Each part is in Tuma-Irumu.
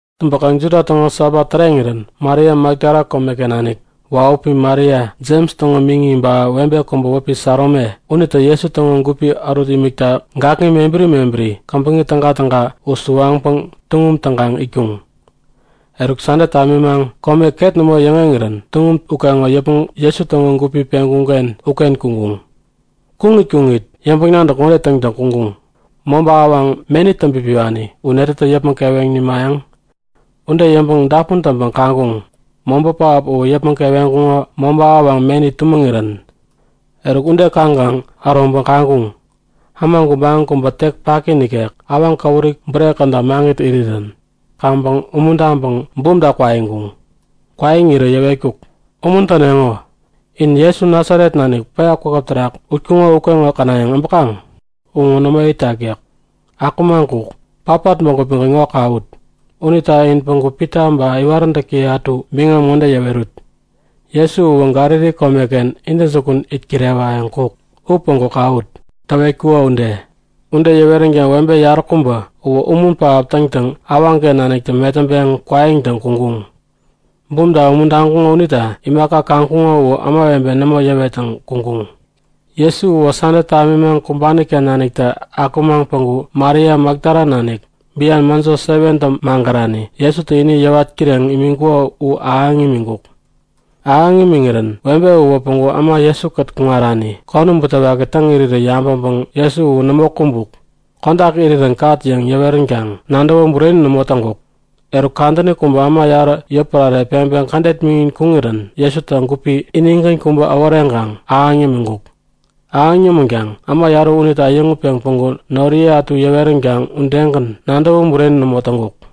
Täŋpäkaŋ Juda täŋo Sabat täreŋirän Maria Makdala komeken nanik, wahupi Maria Jems täŋo miŋi ba webe kubä wäpi Salome unitä Jesu täŋo gupi ärut imikta gakŋi mebäri mebäri käbäŋi tägatäga u suwaŋpäŋ tuŋum täŋkaŋ itkuŋ. Eruk Sande tamimaŋ kome ket nämo yäŋeŋirän tuŋum ukeŋo yäpmäŋ Jesu täŋo gupi peŋkuŋ-ken uken kuŋkuŋ. Kuŋit kuŋit yäŋpäŋ-nadäk ŋode täŋtäŋ kuŋkuŋ; Mobä, awaŋ meni täŋpipiwani u netätä yäpmäŋ keweŋ nimayäŋ? Ude yäŋpäŋ dapun täŋpäŋ kaŋkuŋ; Mobä pähap uwä yäpmäŋ keweŋkuŋo mobä awaŋ meni tumäŋirän. Eruk ude kaŋkaŋ äroŋpäŋ kaŋkuŋ; Äma gubaŋi kubä tek paki nikek awaŋ käwuri bure käda maŋit irirän. Kaŋpäŋ umuntaŋpäŋ bumta kwaiŋkuŋ. Kwaiŋirä yäwetkuk; Umuntäneŋo. In Jesu Nasaret nanik päya kwakäp terak utkuŋo ukeŋo känayäŋ äbäkaŋ? U ŋo nämo itak yäk. Akumaŋ kuk! Patpat bägupigän ŋo kawut! Unita in päŋku Pita ba iwaräntäkiye ätu biŋam ŋode yäwerut; Jesu uwä Galili komeken intäjukun it kirewayäŋ kuk. U päŋku kawut, täwetkuko ude. Ude yäweränkaŋ webe yaräkubä uwä umun pähap täŋkaŋ awaŋken naniktä metäŋpeŋ kwaiŋtäŋ kuŋkuŋ. Bumta umuntaŋkuŋo unita imaka kaŋkuŋo u ämawebe nämo yäwettäŋ kuŋkuŋ. [ Jesu uwä Sande tamimaŋ kumbani-ken naniktä akumaŋ päŋku Maria Makdala nanik, bian mäjo 7tä magärani Jesutä ini yäwat kireŋ imiŋkuko u ahäŋ imiŋkuk. Ahäŋ imiŋirän webe uwä päŋku äma Jesu-kät kuŋarani konäm butewaki täŋ irirä yabäŋpäŋ Jesu u nämo kumbuk, kodak irirän kat yäŋ yäweränkaŋ nadäwä bureni nämo täŋkuk. Eruk kadäni kubä äma yarä yotpärare peŋpeŋ kädet miŋin kuŋirän Jesutä gupi inigän kubä äworeŋkaŋ ahäŋ yämiŋkuk. Ahäŋ yämänkaŋ äma yarä unitä äyäŋutpeŋ päŋku noriye ätu yäweränkaŋ udegän nadäwä bureni nämo täŋkuk.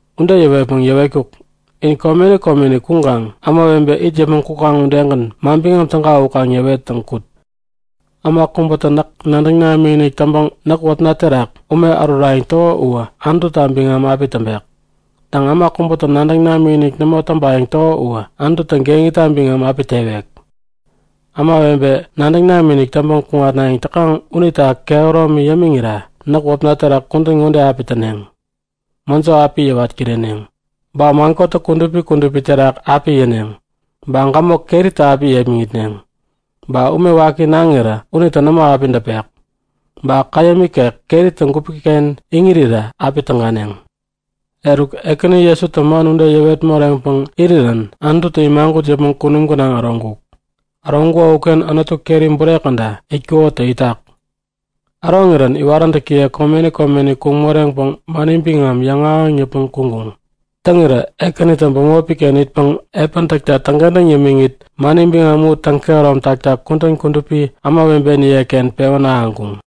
Ude yäŋpäŋ yäwetkuk; In komeni komeni kuŋkaŋ ämawebe it yäpmäŋ kukaŋ udegän Manbiŋam Täga u kaŋ yäwettäŋ kut. Äma kubätä näk nadäŋ namikinik täŋpäŋ näk wäpna terak ume ärurayäŋ täko uwä Anututa biŋam api täŋpek. Täŋ, äma kubätä nadäŋ namikinik nämo täŋpayäŋ täko uwä Anututä geŋita biŋam api tewek. Ämawebe nadäŋ namikinik täŋpäŋ kuŋatnayäŋ täkaŋ unita kehäromi yämiŋira näk wäpna terak kudän ŋode api täneŋ; Mäjo api yäwat kireneŋ, ba man kotäk kudupi kudupi terak api yäneŋ, ba gämok keritä api yepmäŋitneŋ, ba ume waki naŋirä unitä nämo api däpek, ba äma käyäm ikek keritä gupi-ken iŋirirä api täganeŋ. Eruk Ekäni Jesutä man ude yäwet moreŋpäŋ irirän Anututä imagut yäpmäŋ kunum gänaŋ äroŋkuk. Äroŋkuko uken Anutu keri bure käda itkukotä itak. Äroŋirän iwaräntäkiye komeni komeni kuŋ moreŋpäŋ mani biŋam yäŋahäŋ yäpmäŋ kuŋkuŋ. Täŋirä Ekänitä bämopi-ken itpäŋ epäni täkta täŋkentäŋ yämiŋit mani biŋam u täŋkehärom takta kudän kudupi ämawebeniye-ken pewän ahäŋkuŋ.]